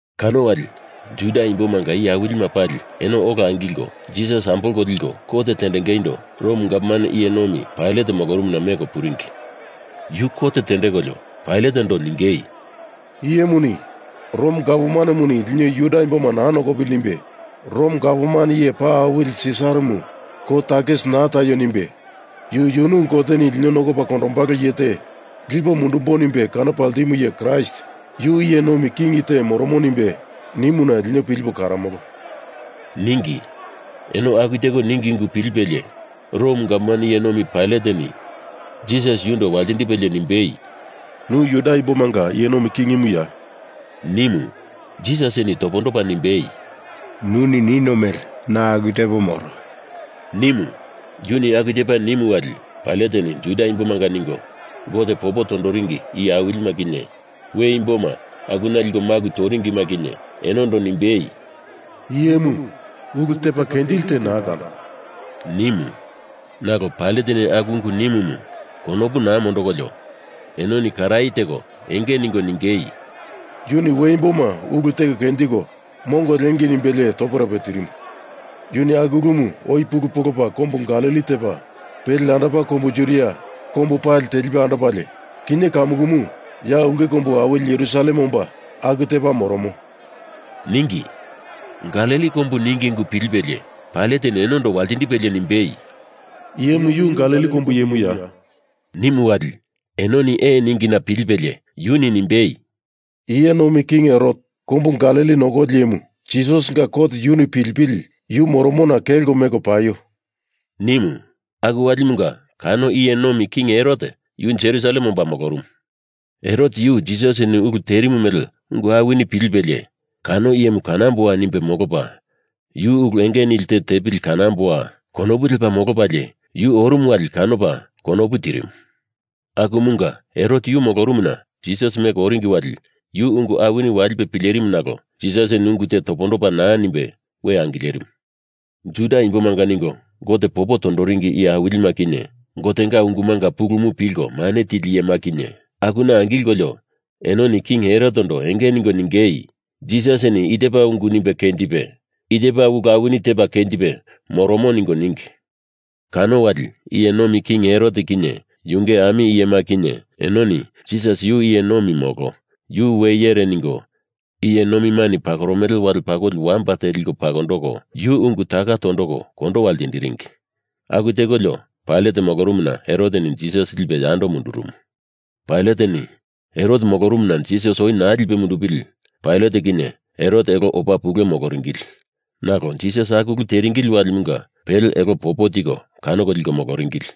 Kano wali Juda imbomanga iye awilima pali eno ola angilko Jisas ambolko liko, kot tendengeindo Rom gavman iye nomi Pailat molorumuna meko puringi. Yu kot tendekolio Pailatendo ningei, “I iyemuni Rom gavmanemuni lino Juda imboma naa nokopili nimbe, Rom gavman iye paa awili Sisaramu kou takisi naa taio nimbe, yu yunu Goteni lino nokopa kondombalo iye te lipo mundumbo nimbe kanopa ltimu iye Kraist, yu iye nomi king te moro nimbe nimuna lino pilipo karomolo,” ningi. Eno aku teko ningi ungu pilipelie Rom gavman iye nomi Pailateni Jisas yundo waltindipelie nimbei, “Nu Juda imbomanga iye nomi kingimuya?” nimu. Jisasini topondopa nimbei, “Nuni nino mele na aku tepo moro,” nimu. Yuni aku tepa nimu wali Pailateni Juda imbomanga ningo Gote popo tondoringi iye awilima kinye, we imboma akuna liko maku toringima kinye, enondo nimbei, “Iyemu ulu tepa kenjili te naa kando,” nimu. Nalo Pailateni aku ungu nimumu konopu naa mondokolio enoni karaye teko enge ningo ningei, “Yuni we imboma ulu teko kenjiko, mongo liengei nimbelie toperope tirimu. Yuni aku ulumu oi pulu polopa kombu Galili tepa, pele yandopa Kombu Judia kombu pali tilipe andopalie, kinye kamukumu ya Ulke Kombu Awili Jerusalem omba aku tepa moromo,” ningi. Galili kombu ningi ungu pilipelie Pailateni enondo waltindipelie nimbei, “Iyemu yu Galili kombu iyemuya?” nimu wali enoni ee ningina pilipelie yuni nimbei, “Iye Nomi King Herot, kombu Galili nokoli iyemu, Jisasinga kot yuni pilipili yu moromona kelko meko paio,” nimu. Aku walimunga kano iye nomi king Herot yu Jerusalem omba molorumu. Herot yu Jisasini ulu terimu mele ungu awini pilipelie, kano iyemu kanamboa nimbe molopa, yuni ulu enge nili te tepili kanamboa! konopu lepa molopalie yu orumu wali kanopa konopu tirimu. Akumunga Herot yu molorumuna Jisas meko oringi wali yu ungu awini walipe pilerimu nalo Jisasini ungu te topondopa naa nimbe we angilerimu. Juda imbomanga ningo Gote popo tondoringi iye awilima kinye, Gotenga ungumanga pulumu pilko mane tili iyema kinye, akuna angilkolio enoni King Herotendo enge ningo ningei, Jisasini i tepa ungu nimbe kenjipe, i tepa ulu awini tepa kenjipe moromo ningo ningi. Kano wali iye nomi King Herot kinye yunge ami iyema kinye enoni Jisas yu iye nomi molo, yu we iyere ningo iye nomimani pakoromele wale pakoli wamba te liko pakondoko, yu ungu taka tondoko kondowa ltindiringi. Aku tekolio Pailat molorumuna Heroteni Jisas lipe yando mundurumu. Pailateni Herot molorumuna Jisas oi naa mundupili Pailat kinye Herot elo opa pule moloringili. Nalo Jisas aku ulu teringili walimunga pele elo popo tiko kanoko liko moloringili.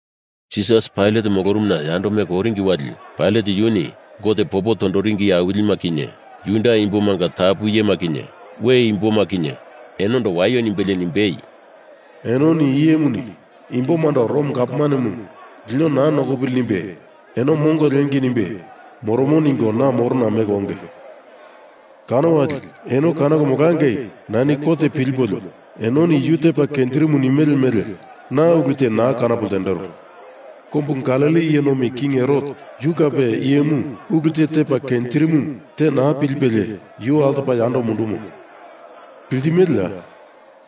Jisas Pailat molorumuna yando meko oringi wali Pailat yuni Gote popo tondoringi iye awilima kinye, Juda Imbomanga tapu iyema kinye, we imboma kinye, enondo waio nimbelie nimbei, “Enoni i iyemuni imbomando Rom gavmanemu lino naa nokopili nimbe eno mongo liengei nimbe moromo ningo na morona meko onge. Kano wali eno kanoko molangei nani kot pilipolio enoni yu tepa kenjirimu nimele mele na ulu te naa kanopo ltendero. Kombu Galili iye nomi King Herot, yu kape i iyemu ulu te tepa kenjirimu te naa pilipelie yu altopa yando mundumo. Piltimeleya?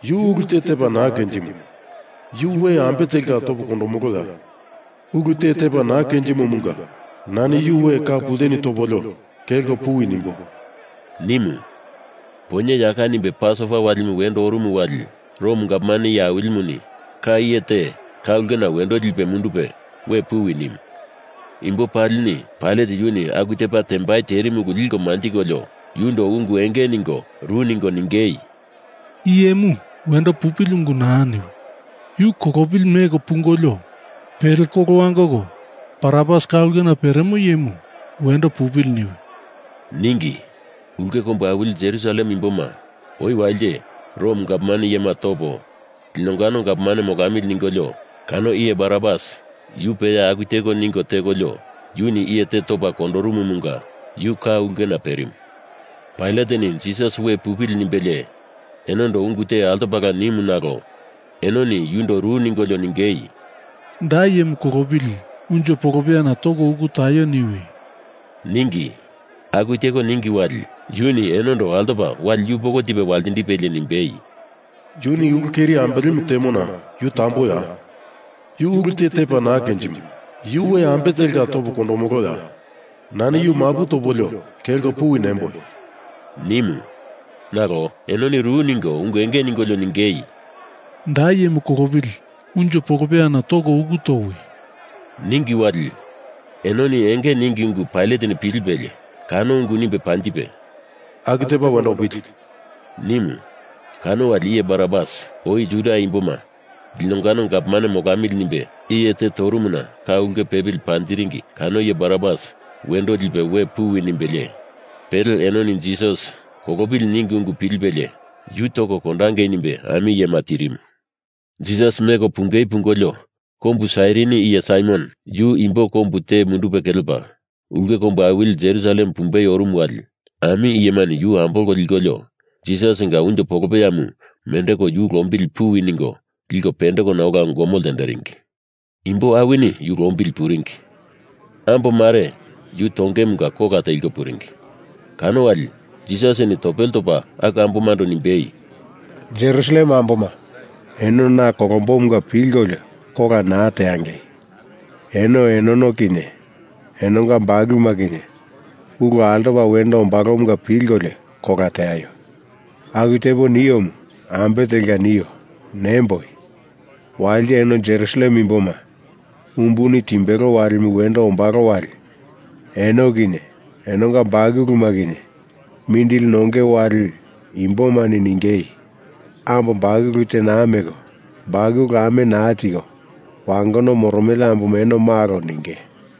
Yu ulu te tepa naa kenjimo. Yu we ambe telka topo kondomoloya? Ulu te tepa naa kenjimomunga nani yu we ka pulteni topolio kelko puwi nimbo,” nimu. Poinye yaka nimbe Pasova wali wendo orumu wali Rom gavman iye awilimuni ka iye te ka ulkena wendo lipe mundupe we puwi nimu. Imbo palini Pailat yuni aku tepa tembai terimu ulu liko manjikolio yundo ungu enge ningo ru ningo ningei, “Iye imu wendo pupili ungu naa niwi! Yu kolopili meko pungolio, pele kolo wangoko Barabas, ka ulkena peremo iyemu, wendo pupili niwi,” ningi. Ulke kombu awili Jerusalem imboma oi walite Rom gavman iyema topo, linongano gavman molamili ningolio kano iye Barabas yu peya aku teko ningo tekolio, yuni iye te topa kondorumumunga yu ka ulkena perimu. Pailateni Jisas we pupili nimbelie enondo ungu te altopala nimu nalo enoni yundo ru ningolio ningei, “Da iyemu kolopili unjo polopeyana toko uku taio niwi,” ningi. Aku teko ningi wali yuni enondo altopa wali yupoko tipe waltindipelie nimbei, “Yuni ulu keri ambelemu temona yu tamboya? Yu ulu te tepa naa kenjimo. Yu we ambe telka topo kondomoloya? Nani yu mapu topolio kelko puwi nemboi,” nimu. Nalo enoni ru ningo ungu enge ningolio ningei, “Da iyemu kolopili unjo polopeyana toko uku towi,” ningi wali enoni enge ningi ungu Pailateni pilipelie kano ungu nimbe panjipe “Aku tepa wendo opili,” nimu, kano wali iye Barabas, oi Juda imboma linongano gavman molamili nimbe iye te torumuna ka ulkena pepili panjiringi kano iye Barabas, wendo lipe we puwi nimbelie, pele enoni Jisas kolopili ningi ungu pilipelie yu toko kondangei nimbe ami iyema tirimu. Jisas meko pungei pungolio, kombu Sairini iye Saimon, yu imbo kombu te mundupe kelepa ulke kombu awili Jerusalem pumbei orumu wali, ami iyemani yu ambolko likolio, Jisasinga unjo polopeyamu mendeko yu lombili puwi ningo liko pendekona ola gomo ltenderingi. Imbo awini yu lombili puringi. Ambo mare yu tongeimunga kola teliko puringi. Kano wali Jisasini topele topa aku ambomando nimbei, “Jerusalem amboma, eno na kolombomunga pilkolio kola naa teangei! Eno enono kinye enonga bakuluma kinye ulu altopa wendo ombalomunga pilkolio kola teaio! Aku tepo niomu, ambe telka nio? Nemboi. Walite eno Jerusalem imboma umbuni timbelo walimu wendo ombalo wali eno kinye enonga bakuluma kinye mindili nonge wali imbomani ningei, ‘Ambo bakulu te naa meko, bakulu ame naa tiko, wangono moromele amboma eno malo,’ ninge.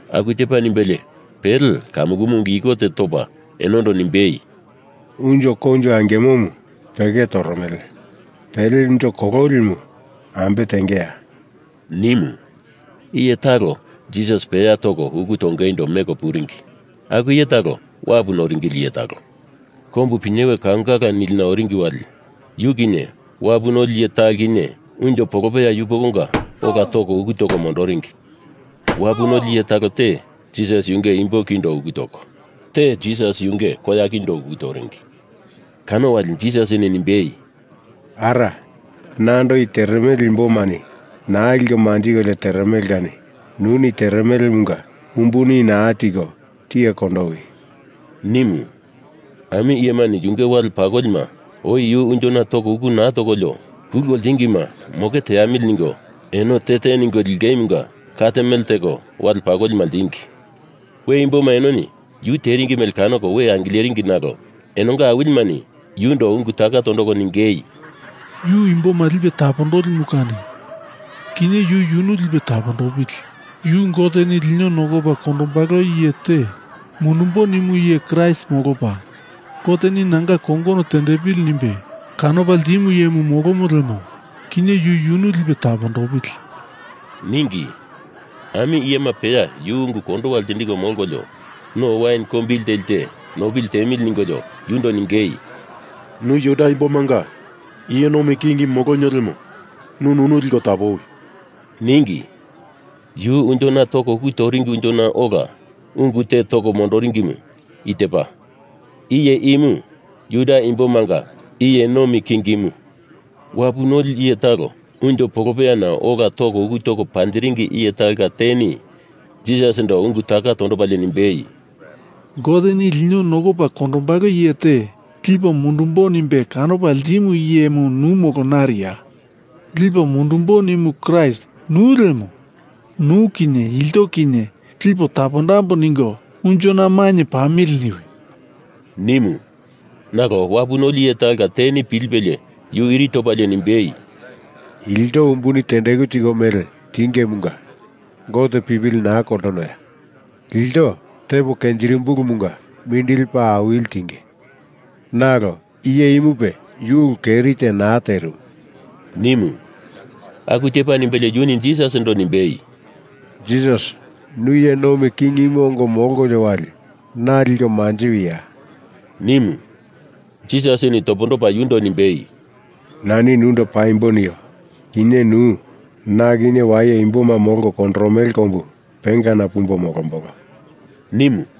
Aku tepa nimbelie pele kamukumu ungu iko te topa enondo nimbei, “Unjo koinjo angimomu peke toromele. Pele unjo kololimu ambe tengeya?” nimu. Iye talo Jisas peya toko uku tongeindo meko puringi. Aku iye talo wapu noringili iye talo. Kombu Pinyewe Kaungala nilina oringi wali yu kinye wapu noli iye talo kinye unjo polopeya yupokonga ola toko uku toko mondoringi. Wapu noli iye talo te Jisas yunge imbo kindo uku toko, te Jisas yunge koya kindo uku toringi. Kano wali Jisasini nimbei, “Ara, nando i teremele imbomani naa liko manjikolio teremele kani nuni teremelemunga umbuni naa tiko tiye kondowi,” nimu. Ami iyemani yunge wale pakolima oi yu unjona toko uku naa tokolio kulko ltingima moke teamili ningo eno te te ningo lingeimunga kat mele teko wale pakolima ltingi. We imboma enoni yu teringi mele kanoko we angileringi nalo enonga awilimani yundo ungu taka tondoko ningei, “Yu imboma lipe tapondolimu kani kinye yu yunu lipe tapondopili! Yu Goteni lino nokopa kondombalo iye te mundumbo nimu iye Kraist molopa, Goteni Nanga kongono tendepili nimbe kanopa ltimu iyemu molomo lemo, kinye yu yunu lipe tapondopili,” ningi. Ami iyema peya yu ungu kondowa ltindiko molkolio no wain kombili teli te nopili tiemili ningolio yundo ningei, “Nu Juda imbomanga iye nomi king molonio lemo nu nunu liko tapowi,” ningi. Yu unjona toko uku toringi unjona ola ungu te toko mondiringimu i tepa: IYE IMU JUDA IMBOMANGA IYE NOMI KINGIMU. Wapu noli iye talo unjo polopeyana ola toko uku toko panjiringi iye talonga teni Jisasindo ungu taka tondopalie nimbei, “Goteni lino nokopa kondombalo iye te lipo mundumbo nimbe kanopa ltimu iyemu nu molo nariya? Lipo mundumbo nimu iye Kraist nu lemo, nu kinye ilto kinye lipo tapondambo ningo unjona mainye pamili niwi,” nimu. Nalo wapu noli iye talonga teni pilipelie yu iri topalie nimbei, “Ilto umbuni tendeku tiko mele tingemunga Gote pipili naa koltonoya? Ilto tepo kenjirimumbulumunga mindili paa awili tinge. Nalo iye imupe yu ulu keri te naa terimu,” nimu. Aku tepa nimbelie yuni Jisasindo nimbei, “Jisas, nu iye nomi kingimu ongo molkolio wali, na liko manjiwia,” nimu. Jisasini topondopa yundo nimbei, “Nani nundo paimbo nio. Kinye nu na kinye waye imboma Molko Kondoromele Kombu Pengana pumbo molombolo,” nimu.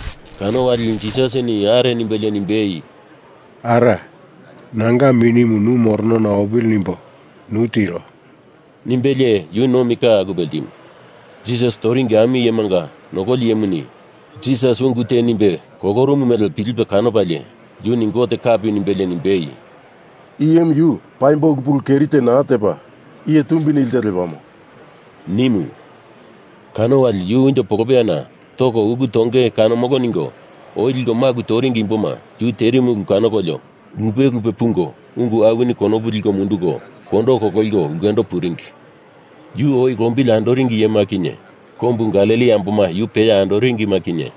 Kano wali Jisasini are nimbelie nimbei, “Ara, nanga minimu nu moronona opili nimbo nu tiro,” nimbelie yu nomi ka akupe ltimu. Jisas toringi ami iyemanga nokoli iyemuni Jisas ungu te nimbe kolorumu mele pilipe kanopalie yuni Gote kapi nimbelie nimbei, “I iyemu yu paimbo ulu pulu keri te naa tepa, iye tumbi nili te lepamo,” nimu. Kano wali yu unjo polopeyana toko uku tonge kanomolo ningo oi liko maku toringi imboma yu terimu ulu kanokolio lupe lupe pungo ungu awini konopu liko munduko kondo kololiko ulkendo puringi. Yu oi lombili andoringi iyema kinye kombu Galili amboma yu peya andoringima kinye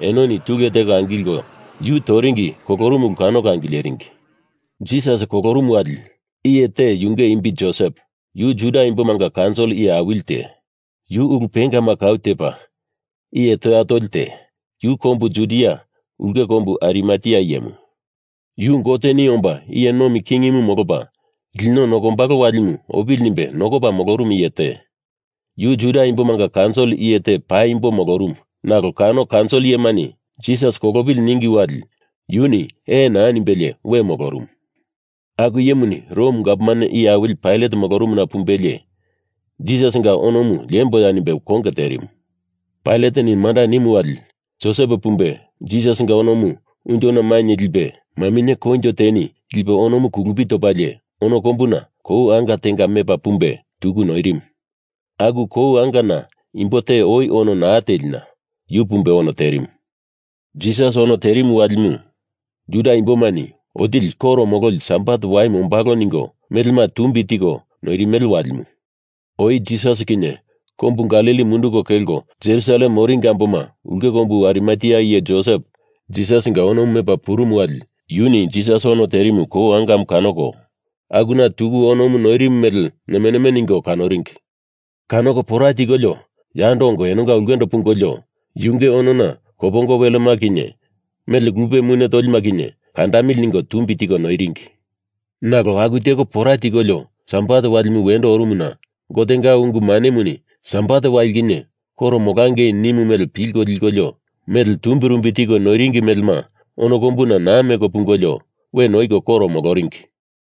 enoni tulu teko angilko yu toringi kolorumu ulu kanoko angileringi. Jisas kolorumu wali, iye te yunge imbi Josep, yu Juda Imbomanga kaunsil iye awili te, yu ulu pengama kau tepa iye toya toli te, yu kombu Judia ulke kombu Arimatea iyemu. Yu Goteni omba iye nomi kingimu molopa lino nokombalo walimu opili nimbe nokopa molorumu iye te. Yu Juda imbomanga kaunsil iye te paimbo molorumu nalo kano kaunsil iyemani Jisas kolopili ningi wali yuni ee naa nimbelie we molorumu. Aku iyemuni Rom gavman iye awili Pailat molorumuna pumbelie Jisasinga onomu liemboya nimbe konge terimu. Pailateni manda nimu wali Josep pumbe Jisasinga onomu unjona mainye lipe, maminye koinjo teni lipe onomu kulupi topalie, ono kombuna kou anga tenga mepa pumbe tuku noirimu. Aku kou angana imbo te oi ono naa telina, yu pumbe ono terimu. Jisas ono terimu walimu, Juda imbomani Otili Koro Mololi Sabat waimu ombalo ningo melema tumbi tiko noirimele walimu. Oi Jisas kinye kombu Galili munduko kelko Jerusalem oringi amboma ulke kombu Arimatea iye Josep Jisasinga onomu mepa purumu wali yuni Jisas ono terimu kou angamu kanoko akuna tuku onomu noirimu mele neme neme ningo kanoringi. Kanoko pora tikolio yando ongo enonga ulkendo pungolio, yunge onona kopongo welema kinye mele lupe mune tolima kinye kandandamili ningo tumbi tiko noiringi. Nalo aku teko pora tikolio sabat walimu wendo orumuna Gotenga ungu manemuni Sabat wali kinye koro molangei nimu mele pilko likolio mele tumbirumbi tiko noiringi melema ono kombuna naa meko pungolio we noiko koro moloringi.